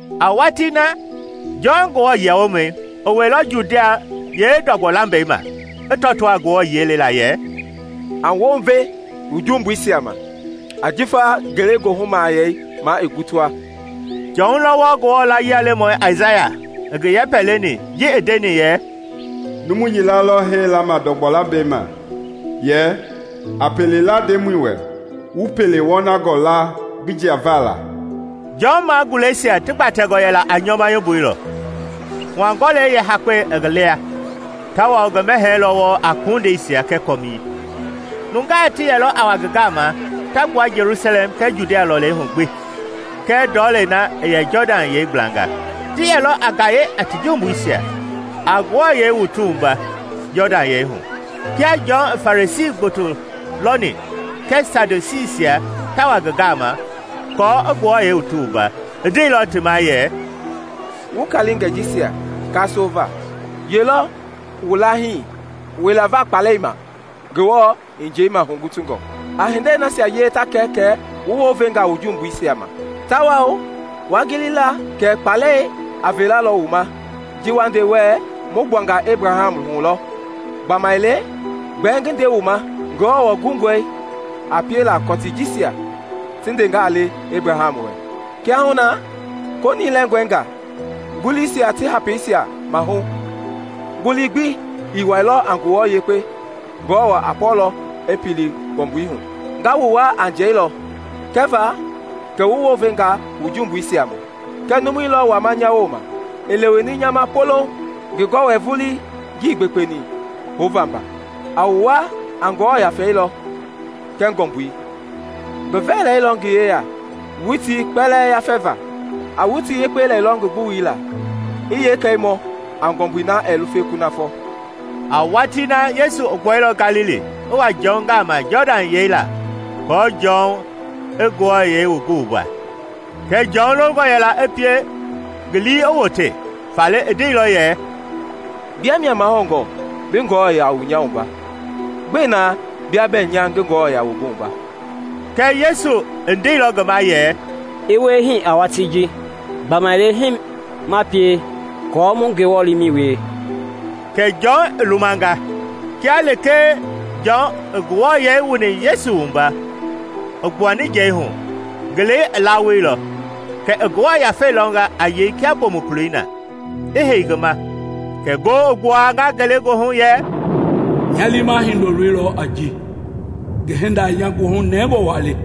A watii na, Jɔn Nguamɔi i wɛilɔ Judia yeendɔgbɔ lambɛi ma i tɔtoo a Ngewɔ yiɛi lɛla yɛ, “A wounve wu jumbuisia ma ajifa Ngelegoohu Mahayɛi ma i gutua!” Jɔn lɔ wɔɔ Ngewɔ layie lemɔi Aisaya i ngi yɛpɛ leni ji i ndeni yɛ, “Numu yila lɔ hee lama ndɔgbɔ lambɛi ma yɛ, ‘A pele la Ndemɔi wɛ; wu pele wɔnangɔ la ngi jiava la!’” Jɔn maguleisia ti gbatɛngɔ yɛla a nyɔma yomboi lɔ, hua-gɔlɛi yeehakpɛi i ngi lia, tawao ngi mɛhɛɛ lɔ wɔɔ a kondeisia kɛɛ kɔmii. Nungaa ti yɛlɔ a wa ngi gama ta gbua Jelusalɛm kɛɛ Judia lɔlei hu gbi kɛɛ ndɔlei na i yɛ Jɔdan yɛi gblanga. Ti yɛlɔ a gaye a ti jumbuisia, a ti wua a Ngewɔ yɛi Jɔdan hu. Kia Jɔn i Farisii gboto lɔni kɛɛ Sadusiisia ta wa ngi gama ti wuavaa, i ndeilɔ ti ma yɛ, “Wu kaalingɛi jisia kaasoo va! Yee lɔ wu lahii wila va kpaalɛi ma Ngewɔ i njeima hugutungɔ? A hindei nasia wie ta kɛ kɛ wu wounvenga wu jumbuisia ma. Tawao waa gili la kɛ kpaalɛi a veelalɔ wu ma ji wa nde wɛɛ, ‘Mu gbuanga Ebraham hu lɔ’; gbamaile, gbɛɛ ngi nde wu ma, Ngewɔ gungɔe a piela kɔtii jisia ti ndeengaa le Ebraham wɛ. Kiahuna koonii lɛngɔenga nguliisia ti hapiisia mahu; ngulu gbi ii wuɛilɔ a nguluwa yekpengaa Ngewɔ a pɔlɔ i pili ngɔmbui hu. Nga wu wua a njɛi lɔ kɛva kɛ wu wounvenga wu jumbuisia ma, kɛɛ numu lɔ wama nya wooma i leweni nya ma poloŋ, ngi gɔwɛi vulii ngii gbekpeni houva mba. A wu wua a Ngewɔ Yafei lɔ kɛɛ ngɔmbui. Ngi vɛɛlei lɔ ngi yeya witii kpɛlɛɛ yafɛva. A witi yekpei lɛlɔ ngi gbuwui la, i yeekɛi mɔ a ngɔmbui na ɛɛ lufe kunafɔ.” A watii na Yesu i gbuailɔ Galili i wa Jɔn gama Jɔdan yɛi la aako Jɔn i ngi wua. Kɛɛ Jɔn longɔ yɛla i pie ngi lii i wote, faale i ndeilɔ yɛ, “Bia mia mahoungɔ bi nya wua. Gbɛe na bɛɛ ngi bi wua?” Yesu i ndeilɔ ngi ma yɛ, “I wie hii a watii ji. Gbamaile hii ma pie aako mu Ngewɔ liimɛi wie.” Kɛ Jɔn i lumanga. Kia lekee Jɔn i Yesu wuani, i gbuani njɛi hu, ngelei i lawoilɔ kɛ i Ngewɔ Yafei lɔnga a yei kia bomukuloi na, i hei ngi ma; kɛ ngoo i gbuanga ngelegoohu yɛ, “Nya liima Hindoloi lɔ a ji, ngi hinda i nya goohu nɛngɔ wa le.”